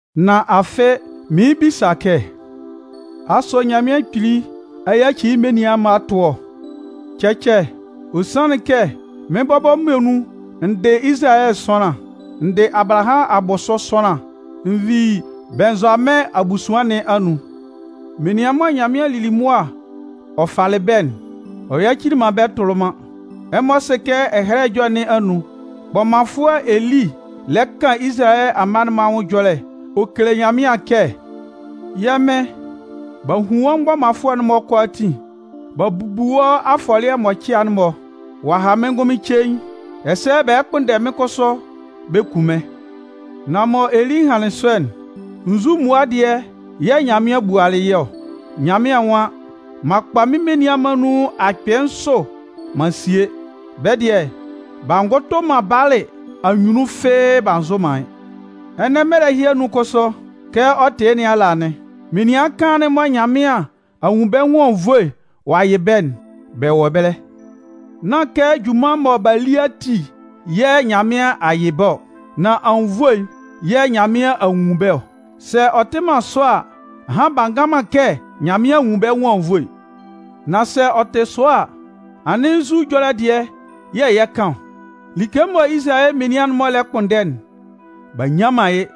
Nan afɩ mɩɩn bisa kɛ: “Asʋ Nyanmɩan Kpili a yaci yɩ́ menian'n-mɔ a tʋ ɔ?” Cɛcɛ! Ɔ sanlɩn kɛ mɩ́n bɔbɔ muonun n dɩ Izalayɛ sʋanlan. N dɩ Abalahamʋn abʋsʋ sʋanlan. N vi Bɩnnzʋamɩn abusuan nɩn anun. Menian mɔ Nyanmɩan lili mʋa ɔ falɩ bɛ́'n, ɔ yacilɩ man bɛ́ tʋlɩ man. Ɛmɔ sɩ kɛ Ɛhɛlɛ Ɛjɔlɛ nɩn anun, kpɔmanfʋɛ Eli lɛ kan Izalayɛ amma'n-mɔ anwʋn ɛjɔlɛ ɔ kele Nyanmɩan kɛ: Yɛ́ Mɩn, b'a hun wɔ́ mgbɔmanfʋɛ'n-mɔ kʋalaatin. B'a bubu wɔ́ afɔlɩɛ mʋcɩa'n-mɔ. Ɔ'a ha mɩ́n ngʋnmɩn cein. Ɛsɛ bɛ lɛ kpʋnndɛ mɩ́n kʋsʋ bɛ kun mɩ́n. Nan mɔ Eli hanlɩn sɔ'n, nzu mmua dɩɛ yɛ̂ Nyanmɩan bualɩ yɩ́ ɔ? Nyanmɩan nwan: M'an kpa mɩ́n menian akpɩɩ nsʋ man sie. Bɛ́ dɩɛ, b'a ngʋtʋ man Baalɩ anyunnun fɩ́ɩ́ b'a nzʋ man yɩ́ Ɛnɛ mɛlɛ ɛhɩ anun kʋsʋ, kɛ ɔ tɩ yɩ́ nɩn ala anɩn. Menian kaan'n mɔ Nyanmɩan a nwun bɛ́ nwʋn anwunnvoe ɔ'a yɩ bɛ́'n, bɛ wɔ ɛbɛlɛ. Nán kɛ junman mɔ b'a li ati yɛ̂ Nyanmɩan a yɩ bɛ́ ɔ. Nan anwunnvoe yɛ̂ Nyanmɩan a nwun bɛ́ ɔ. Sɛ ɔ tɩ man sɔ a, ahan bɛ ngan man kɛ Nyanmɩan a nwun bɛ́ nwʋn anwunnvoe. Nan sɛ ɔ tɩ sɔ a, anɩn nzu ɛjɔlɛ dɩɛ yɛ̂ yɛ 'kan ɔ? Like mɔ Izalayɛ menian'n-mɔ lɛ kpʋnndɛ'n, b'a nnyan man yɩ́.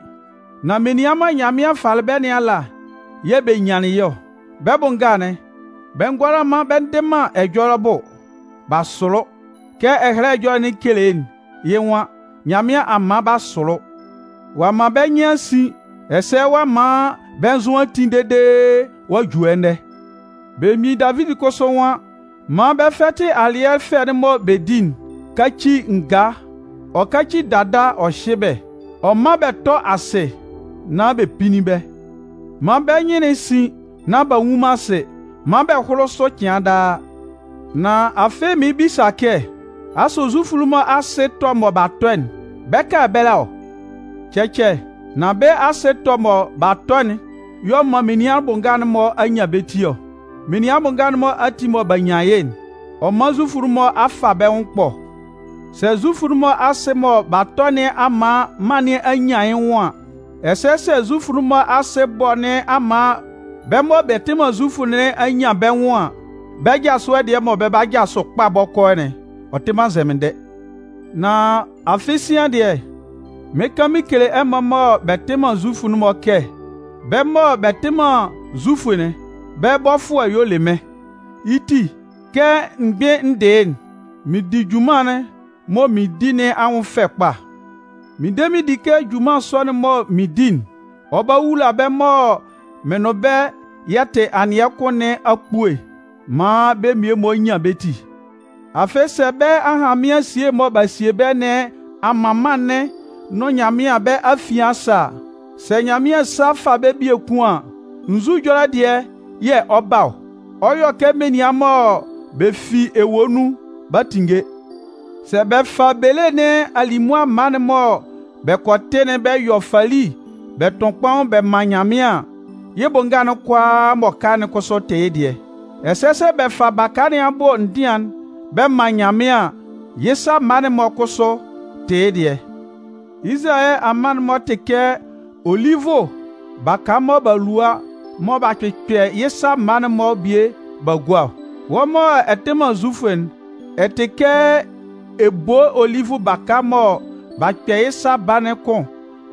Nan menian mɔ Nyanmɩan falɩ bɛ́ nɩn ala yɛ̂ bɛ nyanlɩn yɩ́ ɔ. Bɛ́ bʋ nga'n, bɛ ngʋala bɛ ndɩ man ɛjɔlɛ bʋ, b'a sʋlʋ. Kɛ Ɛhɛlɛ Ɛjɔlɛ'n kele'n, yɩ́ nwan: Nyanmɩan a man b'a sʋlʋ. Ɔ'a man bɛ́ nyɩn a sin ɛsɛ ɔ'a man bɛ́ nzʋ a ti dede ɔ'a ju ɛnɛ. Belemgbin Davidi kʋsʋ nwan: Man bɛ́ fɛtɩ alɩɛ fɛ'n mɔ bɛ di'n káci ngaa, ɔ káci dada ɔ hyɩ́ bɛ́, ɔ mán bɛ tɔ́ asɩ nán bɛ pínnin bɛ́. Man bɛ́ nyɩn'n sín, nán b'a nnwun man asɩ, man bɛ́ hʋ́lʋ sʋ cɩan daa. Nan afɩ mɩɩn bisa kɛ: “Asʋ Zufʋ'n-mɔ asɩ ɛtɔ mɔ b'a tɔ'n, bɛ 'ka ɛbɛlɛ ɔ?” Cɛcɛ! Nan bɛ́ asɩ ɛtɔ'n mɔ b'a tɔ'n y'ɔ man menian bʋ nga'n-mɔ a nyan bɛ́ ti ɔ. Menian bʋ nga'n-mɔ ati mɔ b'a nyan yɩ́'n, ɔ man Zufʋ'n-mɔ a fa bɛ́ nwʋn ɛkpɔ. Sɛ Zufʋ'n-mɔ asɩ mɔ b'a tɔ nɩn a man mân nɩn anyan yɩ́ nwʋn, ɛsɛ sɛ Zufʋ'n-mɔ asɩ ɛbɔ nɩn a man bɛ́ mɔ bɛ tɩ man Zufʋ nɩn a nyan bɛ́ nwʋn an, bɛ́ ɛjasʋɛ dɩɛ mɔ bɛ 'ba jasʋ kpa bɔkɔɔ'n, ɔ tɩ man nzɛmɩndɛ! Nan afɩ sian dɩɛ, mɩɩn kan mɩn kele ɛmɔ mɔ bɛ tɩ man Zufʋ'n kɛ bɛ́ mɔ bɛ tɩ man Zufʋ'n, bɛ́ bɔfʋɛ'n y'ɔ le mɩ́n. Yɩ́ ti kɛ n gbɩn n dɩ yɩ́'n, mɩn di junman'n mɔ mɩn di nɩn anwʋn fɛ kpa. Mɩn de mɩn di kɛ junman sɔ'n mɔ mɩn di'n, ɔ 'ba wula bɛ́ mɔ mɩn nʋn bɛ́ yɛ tɩ anɩɛ kʋn nɩn akpue maan bɛ́ mmie-mɔ nyan bɛ́ ti. Afɩ sɛ bɛ́ ahanmɩan esie mɔ b'a sie bɛ́ nɩn a man mân'n nʋn Nyanmɩan bɛ́ afian a sɛ a, sɛ Nyanmɩan sa fa bɛ́ biekun an, nzu ɛjɔlɛ dɩɛ yɛ̂ ɔ 'ba ɔ? Ɔ 'yɔ kɛ menian mɔ bɛ fi ewue nun b'a tinnge! Sɛ bɛ fa bele nɩn alimʋa mma'n mɔ bɛ kɔ tɩ'n bɛ yɔ fali bɛ tʋn kpaun bɛ man Nyanmɩan an, yɩ́ bʋ nga'n kʋalaa m'ɔ ka'n kʋsʋ tɩ yɩ́ dɩɛ. Ɛsɛ sɛ bɛ fa baka nɩn abʋ ndɩan'n bɛ man Nyanmɩan an, yɩ́ sa mma'n-mɔ kʋsʋ tɩ yɩ́ dɩɛ. Izalayɛ amma'n-mɔ tɩ kɛ olivʋ baka mɔ b'a lua mɔ b'a kpɩkpɛ yɩ́ sa mma'n-mɔ bie b'a gua ɔ. Wɔ́ mɔ ɛ tɩ man Zufʋ'n, ɛ tɩ kɛ ebolo olivʋ baka mɔ b'a kpɛ yɩ́ sa baa'n kʋn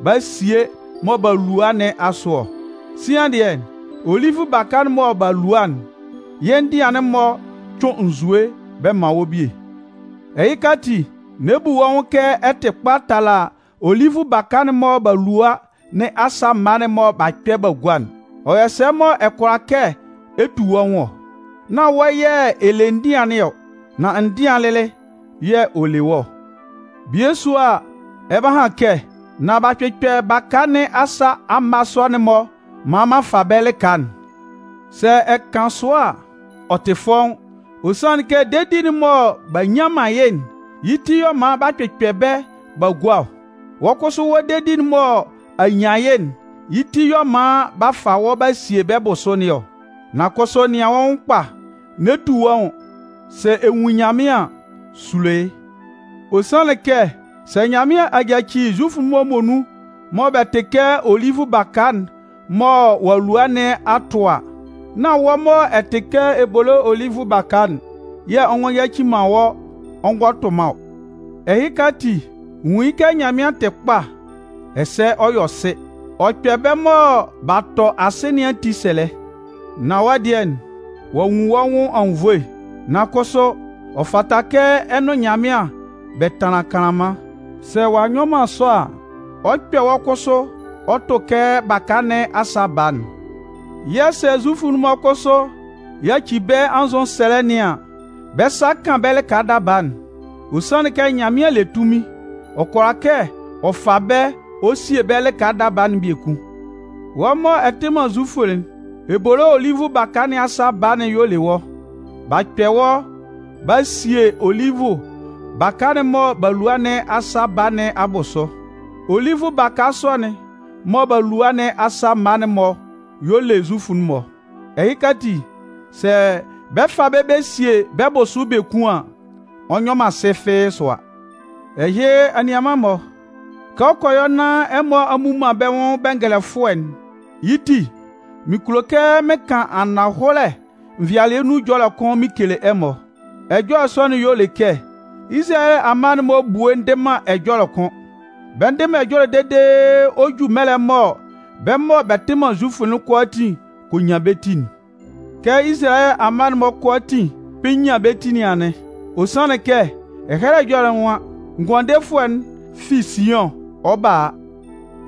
b'a sie mɔ b'a lua nɩn asʋ ɔ. Sian dɩɛ, olivʋ baka'n mɔ b'a lua'n, yɩ́ ndɩan'n-mɔ cʋɩn nzue bɛ man wɔ́ bie. Ɛhɩka ati, n'ɛ bu wɔ́ nwʋn kɛ ɛ tɩ kpa tala olivʋ baka'n mɔ b'a lua nɩn asa mma'n mɔ b'a kpɛ b'a gua'n. Ɔ yɔ sɛ mɔ ɛ kʋala kɛ ɛ tu wɔ́ nwʋn ɔ? Nán wɔ́ yɛ̂ ɛ le ndɩan nɩn ɔ, nan ndɩan'n lɩlɩ yɛ̂ ɔ le wɔ́ ɔ. Bie sʋa a, ɛ 'ba han kɛ: “Nan b'a kpɩkpɛ baka nɩn asa amma sɔ'n-mɔ maan m'an fa bɛ́ lɩka'n.” Sɛ ɛ kan sɔ a, ɔ tɩ fɔ́ʋ́n. Ɔ sanlɩn kɛ dedi'n mɔ b'a nnyan man yɩ́'n, yɩ́ ti yɛ̂ ɔ man b'a kpɩkpɛ bɛ́ b'a gua ɔ. Wɔ́ kʋsʋ wɔ́ dedi'n mɔ a nyan yɩ́'n, yɩ́ ti y'ɔ man b'a fa wɔ́ b'a sie bɛ́ bʋsʋ nɩn ɔ. Nan kʋsʋ nɩan wɔ́ nwʋn kpa, n'ɛ tu wɔ́ nwʋn! Sɛ ɛ nwun Nyanmɩan an, sulo yɩ́. Ɔ sanlɩn kɛ, sɛ Nyanmɩan a yaci Zufʋ'n-mɔ muonun mɔ bɛ tɩ kɛ olivʋ baka'n mɔ ɔ'a lua nɩn ɔ'a tʋ a, nán wɔ́ mɔ ɛ tɩ kɛ ebolo olivʋ baka'n yɛ̂ ɔ ngɔ yaci man wɔ́ ngɔ tʋ man ɔ. Ɛhɩka ati, nwun yɩ́ kɛ Nyanmɩan tɩ kpa ɛsɛ ɔ yɔ sɩ. Ɔ kpɛ bɛ́ mɔ b'a tɔ asɩ nɩn ati sɛlɛ. Nan wɔ́ dɩɛ, ɔ'a nwun wɔ́ nwʋn anwunnvoe. Nan kʋsʋ, ɔ fata kɛ ɛ nʋn Nyanmɩan bɛ tanlan kanlanman. Sɛ ɔ'a nyɔ man sɔ a, ɔ 'kpɛ wɔ́ kʋsʋ ɔ tʋ kɛ baka nɩn asa baa'n. Yɛ̂ sɛ Zufʋ'n-mɔ kʋsʋ yaci bɛ́ anzʋsɛlɛ nɩn an, bɛ sa 'kan bɛ́ lɩka daba'n. Ɔ sanlɩn kɛ Nyanmɩan le tunmin, ɔ kʋala kɛ ɔ fa bɛ́ ɔ sie bɛ́ lɩka daba'n biekun. Wɔ́ mɔ ɛ tɩ man Zufʋ'n, ebolo olivʋ baka nɩn asa baa'n y'ɔ le wɔ́. B'a kpɛ wɔ́ b'a sie olivʋ baka'n mɔ b'a lua nɩn asa baa nɩn abʋsʋ. olivʋ baka sɔ'n mɔ b'a lua nɩn asa mma'n-mɔ y'ɔ le Zufʋ'n-mɔ. Ɛhɩka ati, sɛ bɛ 'fa bɛ́ bɛ sie bɛ́ bʋsʋ'n biekun an, ɔ nyɔ man sɩ fɩ́ɩ́ sʋa. Ɛhɩ, anianman-mɔ, kɛ ɔ kɔ yɔ nán ɛmɔ a mmu man bɛ́ nwʋn bɛngɛlɛfʋɛ'n, yɩ́ ti, mɩn kulo kɛ mɩn kan ananhɔlɛ nvɩalɩɛ nun ɛjɔlɛ kʋn mɩn kele ɛmɔ. Ɛjɔlɛ sɔ'n, y'ɔ le kɛ Izalayɛ amma'n-mɔ ebue ndɩ man ɛjɔlɛ kʋ́n. Bɛ ndɩ man ɛjɔlɛ dede ɔ 'ju mɛlɛ mɔ bɛ́ mɔ bɛ tɩ man Zufʋ'n kʋalaatin kɔ nyan bɛ́ ti'n. Kɛ Izalayɛ amma'n-mɔ kʋalaatin 'kpɩn nyan bɛ́ ti nɩn anɩn. Ɔ sanlɩn kɛ Ɛhɛlɛ Ɛjɔlɛ'n nwan: Ngʋandefʋɛ'n fi Siʋn ɔ 'ba a.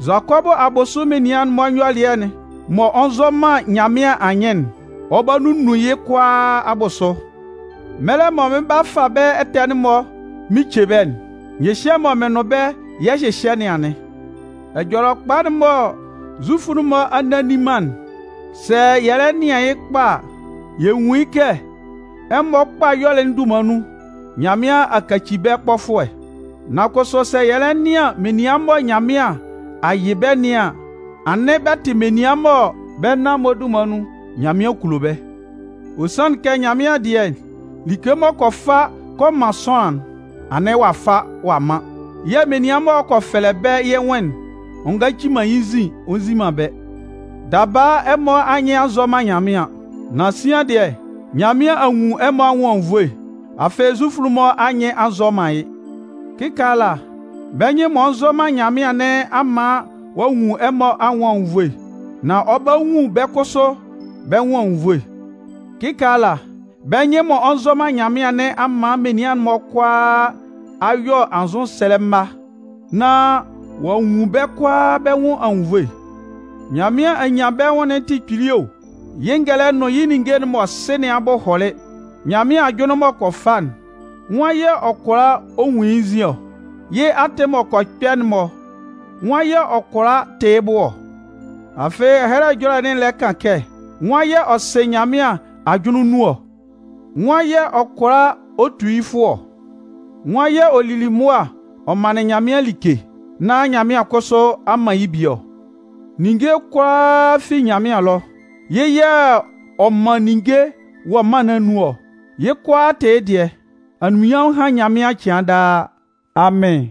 Zʋakɔbʋ abʋsʋ menian'n-mɔ nyɔlɩɛ'n mɔ ɔ nzɔ man Nyanmɩan anyɩn'n, ɔ 'ba nunnun yɩ́ kʋalaa abʋsʋ. Mɛlɛ mɔ mɩn 'ba fa bɛ́ ɛtɛ'n-mɔ mɩn ce bɛ́'n, nyɩhyɛ mɔ mɩn nʋn bɛ́ yɛ 'hyɩhyɛ nɩn anɩn. Ɛjɔlɛkpa'n mɔ Zufʋ'n-mɔ a nne a nni man'n, sɛ yɛ lɛ nɩan yɩ́ kpa a, yɛ nwun yɩ́ kɛ ɛmɔ kpa ɛyɔlɛ dunman nun, Nyanmɩan a kaci bɛ́ kpɔfʋɛ. Nan kʋsʋ sɛ yɛ lɛ nɩan menian mɔ Nyanmɩan a yɩ bɛ́ nɩn an, anɩn bɛ tɩ menian mɔ bɛ́ nan-mɔ dunman nun, Nyanmɩan kulo bɛ́. Ɔ sanlɩn kɛ Nyanmɩan dɩɛ, like m'ɔ kɔ fa kɔ man sʋanlan'n, anɩn ɔ'a fa ɔ'a man. Yɛ̂ menian m'ɔ kɔ fɛlɛ bɛ́ yɩ́ nwʋn'n, ɔ ngaci man yɩ́ nzin ɔ nzi man bɛ́. Daba, ɛmɔ anyɩn a nzɔ man Nyanmɩan. Nan sian dɩɛ, Nyanmɩan a nwun ɛmɔ anwʋn anwunnvoe. Afɩ Zufʋ'n-mɔ anyɩn a nzɔ man yɩ́. Kɩkaala, bɛ́ nyɩn m'ɔ nzɔ man Nyanmɩan nɩn a man ɔ'a nwun ɛmɔ anwʋn anwunnvoe. Nan ɔ 'ba nwun bɛ́ kʋsʋ bɛ́ nwʋn anwunnvoe. Kɩkaala bɛ́ nyɩn m'ɔ nzɔ man Nyanmɩan nɩn a man menian'n-mɔ kʋalaa a yɔ anzʋsɛlɛ mma, nán ɔ'a nwun bɛ́ kʋalaa bɛ́ nwʋn anwunnvoe. Nyanmɩan anyanbɛnwʋn'n tɩ kpili o! Yɩ́ ngɛlɛ nʋn yɩ́ ninnge'n m'ɔ sɩ nɩn abʋ hɔlɩ! Nyanmɩan ajʋnlɩn m'ɔ kɔ fa'n, nwan yɛ̂ ɔ kʋala ɔ nwun yɩ́ nzin ɔ? Yɩ́ atɩn m'ɔ kɔ kpɛ'n-mɔ, nwan yɛ̂ ɔ kʋala tɩ yɩ́ bʋ ɔ? Afɩ Ɛhɛlɛ Ɛjɔlɛ'n lɛ kan kɛ: Nwan yɛ̂ ɔ sɩ Nyanmɩan ajʋnlɩn nun ɔ? Nwan yɛ̂ ɔ kʋala ɔ tu yɩ́ fʋɔ ɔ? Nwan yɛ̂ ɔ lili mʋa ɔ manlɩn Nyanmɩan like nán Nyanmɩan kʋsʋ a man yɩ́ bie ɔ? Ninnge kʋalaa fi Nyanmɩan ɛlɔ, yɩ́ yɛ̂ ɔ man ninnge wɔ mân nɩn anun ɔ, yɩ́ kʋalaa tɩ yɩ́ dɩɛ. Anunminnyanmʋn hán Nyanmɩan cɩan daa! Amɩn.